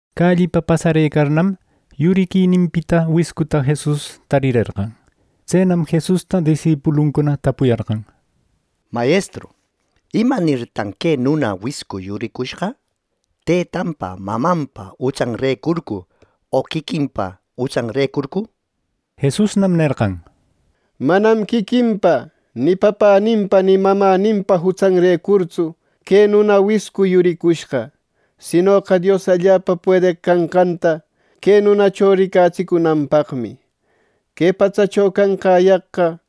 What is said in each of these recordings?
Callipa pasarëcarnam, yuriquininpita wiscuta Jesus tarerqan. Tsenam Jesusta disipuluncuna tapuyarqan: —Mayestru, ¿imanirtan que nuna wiscu yuricushqa? ¿Tëtanpa, mamanpa jutsanrecurcu, o quiquinpa jutsanrecurcu? Jesusnam nerqan: —Manam quiquinpa ni papäninpa ni mamäninpa jutsanrecurtsu que nuna wiscu yuricushqa, sinoqa Dios allapa puedeq canqanta que nunacho ricatsicunanpaqmi Que patsacho canqäyaqqa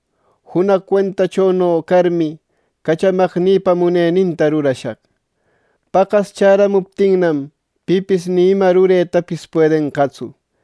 junaq cuentachono carmi, cachamaqnïpa muneninta rurashaq. Paqas chäramuptinnam, pipis ima ruretapis puedenqatsu.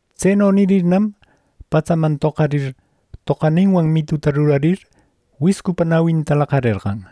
Tseno nirirnam, patsaman toqarir, toqaninwan mituta rurarir wiscupa nawinta laqarerqan.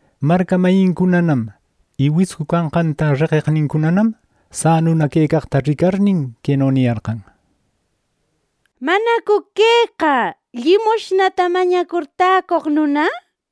Marca mayincunanam y wiscu canqanta reqeqnincunanam sanuna quecaqta ricarnin, queno niyarqan: —¿Manacu queqa llimushnata mañacur täcoq nuna? —nir.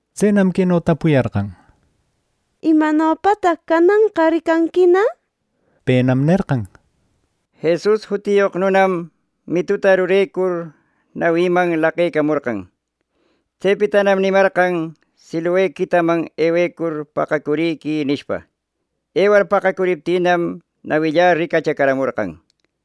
Tsenam queno tapuyarqan: —¿Imanopataq cananqa ricanquina? —nir. Penam nerqan: —Jesus jutiyoq nunam mituta rurecur, nawïman laqecamorqan. Tsepitanam nimarqan, ‘Siloe quitaman ewecur, paqacuriquï’ nishpa. Ewar paqacuriptïnam, nawillä ricachacaramorqan —nir.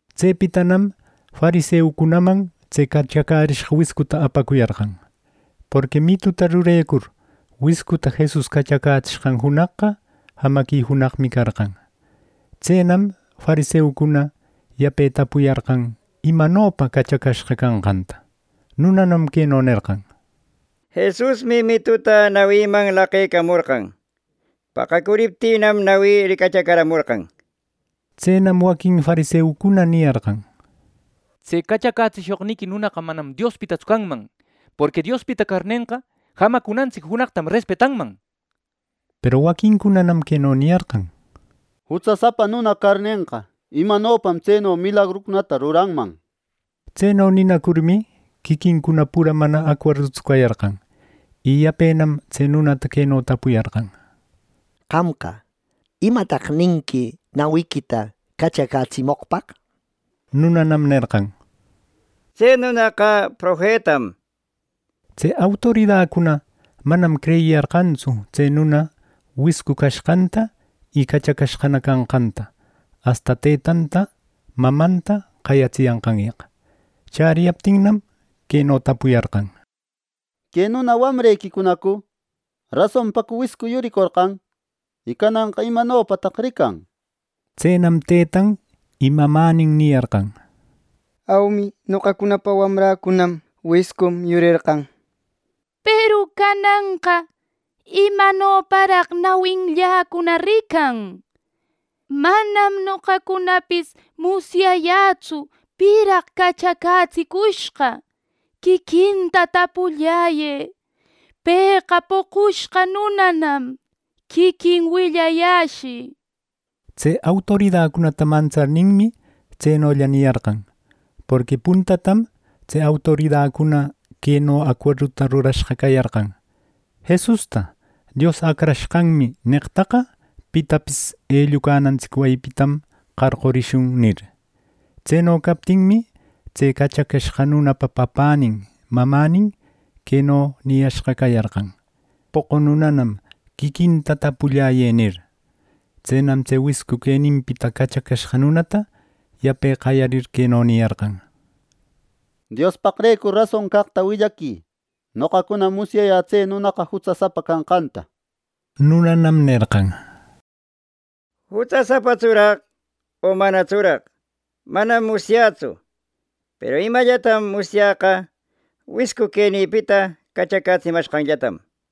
Tsepitanam fariseucunaman tse cachacärishqa wiscuta apacuyarqan, porqui mituta rurecur wiscuta Jesus cachacätsishqan junaqqa jamaqui junaqmi carqan. Tsenam fariseucuna yape tapuyarqan imanopa cachacashqa canqanta. Nunanam queno nerqan: —Jesusmi mituta nawiman laqecamorqan. Paqacuriptïnam, nawï ricachacaramorqan —nishpa. Tsenam waquin fariseucuna niyarqan: —Tse cachacätsishoqniqui nunaqa manam Diospitatsu canman; porqui Diospita carnenqa, jamacunantsic junaqtam respetanman —nir. Peru waquincunanam queno niyarqan: —Jutsasapa nuna carnenqa, ¿imanopam tseno milagrucunata ruranman? —nir. Tseno ninacurmi, quiquincuna pura mana acuerdutsu cayarqan. Y yapenam tse nunata queno tapuyarqan: —Qamqa, ¿imataq ninqui nawiquita cachacätsimoqpaq? —nir. Nunanam nerqan: —Tse nunaqa profetam —nir. Tse autoridacuna manam creyiyarqantsu tse nuna wiscu cashqanta y cachacashqana canqanta asta tëtanta mamanta qayatsiyanqanyaq. Chäriyaptinnam, queno tapuyarqan: —¿Que nuna wamrequicunacu? ¿Rasonpacu wiscu yuricorqan? ¿Y cananqa imanopataq rican? —nir. Tsenam tëtan y mamänin niyarqan: —Aumi. Noqacunapa wamräcunam. Wiscum yurerqan. Peru cananqa ¿imanoparaq nawinlläcuna rican? Manam noqacunapis musyayätsu piraq cachacätsicushqa. Quiquinta tapulläyë; pëqa poqushqa nunanam. Quiquin willayäshï —nir. Tse autoridacunata mantsarninmi tsenolla niyarqan, porqui puntatam tse autoridacuna queno acuerduta rurashqa cayarqan “ ‘Jesusta Dios Acrashqanmi’ neqtaqa pitapis ellucanantsic wayipitam qarqurishun” nir. Tseno captinmi, tse cachacashqa nunapa papänin mamänin queno niyashqa cayarqan, “Poqu nunanam; quiquinta tapulläyë” nir. Tsenam tse wiscu queninpita cachacashqa nunata yape qayarir, queno niyarqan: —¡Diospaqrecur rason caqta willaquï! Noqacunam musyayä tse nunaqa jutsasapa canqanta —nir. Nunanam nerqan: —¿Jutsasapatsuraq o manatsuraq? Manam musyätsu, peru imallatam musyäqa wiscu quenïpita cachacätsimashqanllatam —nir.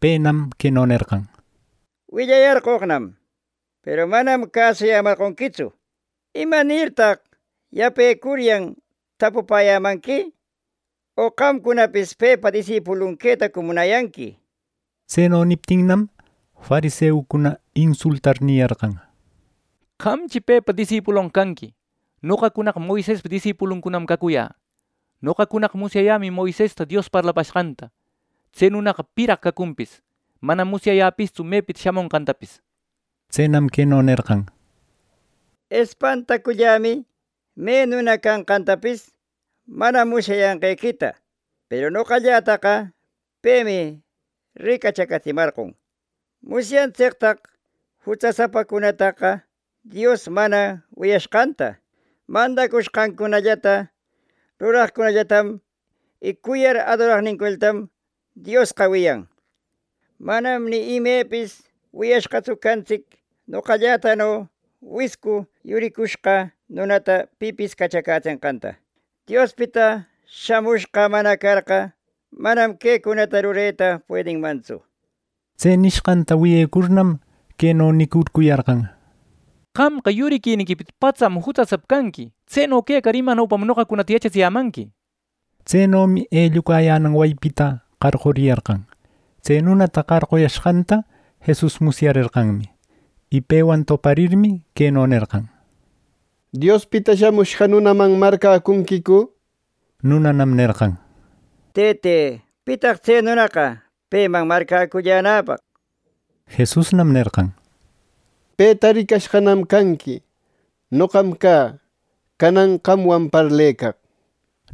Penam queno nerqan: —Willayarqoqnam, peru manam cäsuyämarqonquitsu. ¿Imanirtaq yapecuryan tapupäyämanqui, o qamcunapis pepa disipuluncuna quetacu munayanqui? —nir. Tseno niptinnam, fariseucuna insultar niyarqan: —¡Qamchi pepa disipulonqa canqui! ¡Noqacunaqa Moisespa disipuluncunam cacuyä! Noqacunaqa musyayämi Moisesta Dios parlapashqanta. Tse nunaqa ¿piraq cacunpis? Manam musyayäpistsu mepita shamushqantapis —nir. Tsenam queno nerqan: —Espantacullämi me nuna canqantapis mana musyayanqequita, peru noqallätaqa pemi ricachacaratsimarqon. ¡Musyantsictaq jutsasapacunataqa Dios mana wiyanqanta! Mandacushqancunata ruraqcunallatam y cuyar adoraqnincunallatam Diosqa wiyan. Manam ni imepis wiyashqatsu cantsic noqallätano wiscu yuricushqa nunata pipis cachacätsishqanta. Diospita shamushqa mana carqa, manam quecunata rureta puedinmantsu —nir. Tse nishqanta wiyecurnam, queno nicurcuyarqan: —¡Qamqa yuriquiniquipita patsam jutsasapa canqui! Tseno quecar, ¿imanopam noqacunata yachatsiyämanqui! —nir. Tsenomi ellucayänan wayipita qarquriyarqan. Tse nunata qarquyashqanta Jesus musyarerqanmi. Y pewan toparirmi, queno nerqan: —¿Diospita Shamushqa Nunaman marcäcunquicu? —nir. Nunanam nerqan: —Tëte, ¿pitan tse nunaqa peman marcäcullänäpaq? —nir. Jesusnam nerqan: —Peta ricashqanam canqui; noqam cä, canan qamwan parlecaq —nir.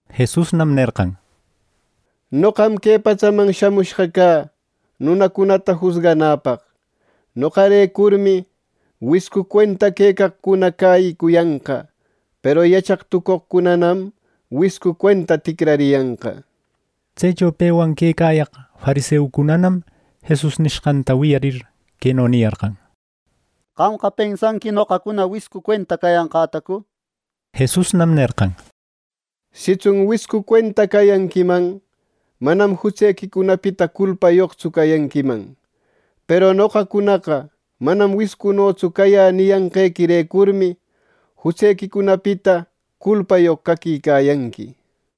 Jesusnam nerqan: —Noqam que patsaman shamushqa cä nunacunata jusganäpaq. Noqarecurmi, wiscu cuenta quecaqcuna cäyicuyanqa, peru yachaq tucoqcunanam wiscu cuenta ticrariyanqa —nir. Tsecho pewan quecayaq fariseucunanam Jesus nishqanta wiyarir, queno niyarqan: —¿Qamqa pensanqui noqacuna wiscu cuenta cayanqätacu? —nir. Jesusnam nerqan: —Sitsun wiscu cuenta cayanquiman, manam jutsequicunapita culpayoqtsu cayanquiman; peru noqacunaqa manam wiscunotsu cayä niyanqequirecurmi, jutsequicunapita culpayoq caquicayanqui —nir.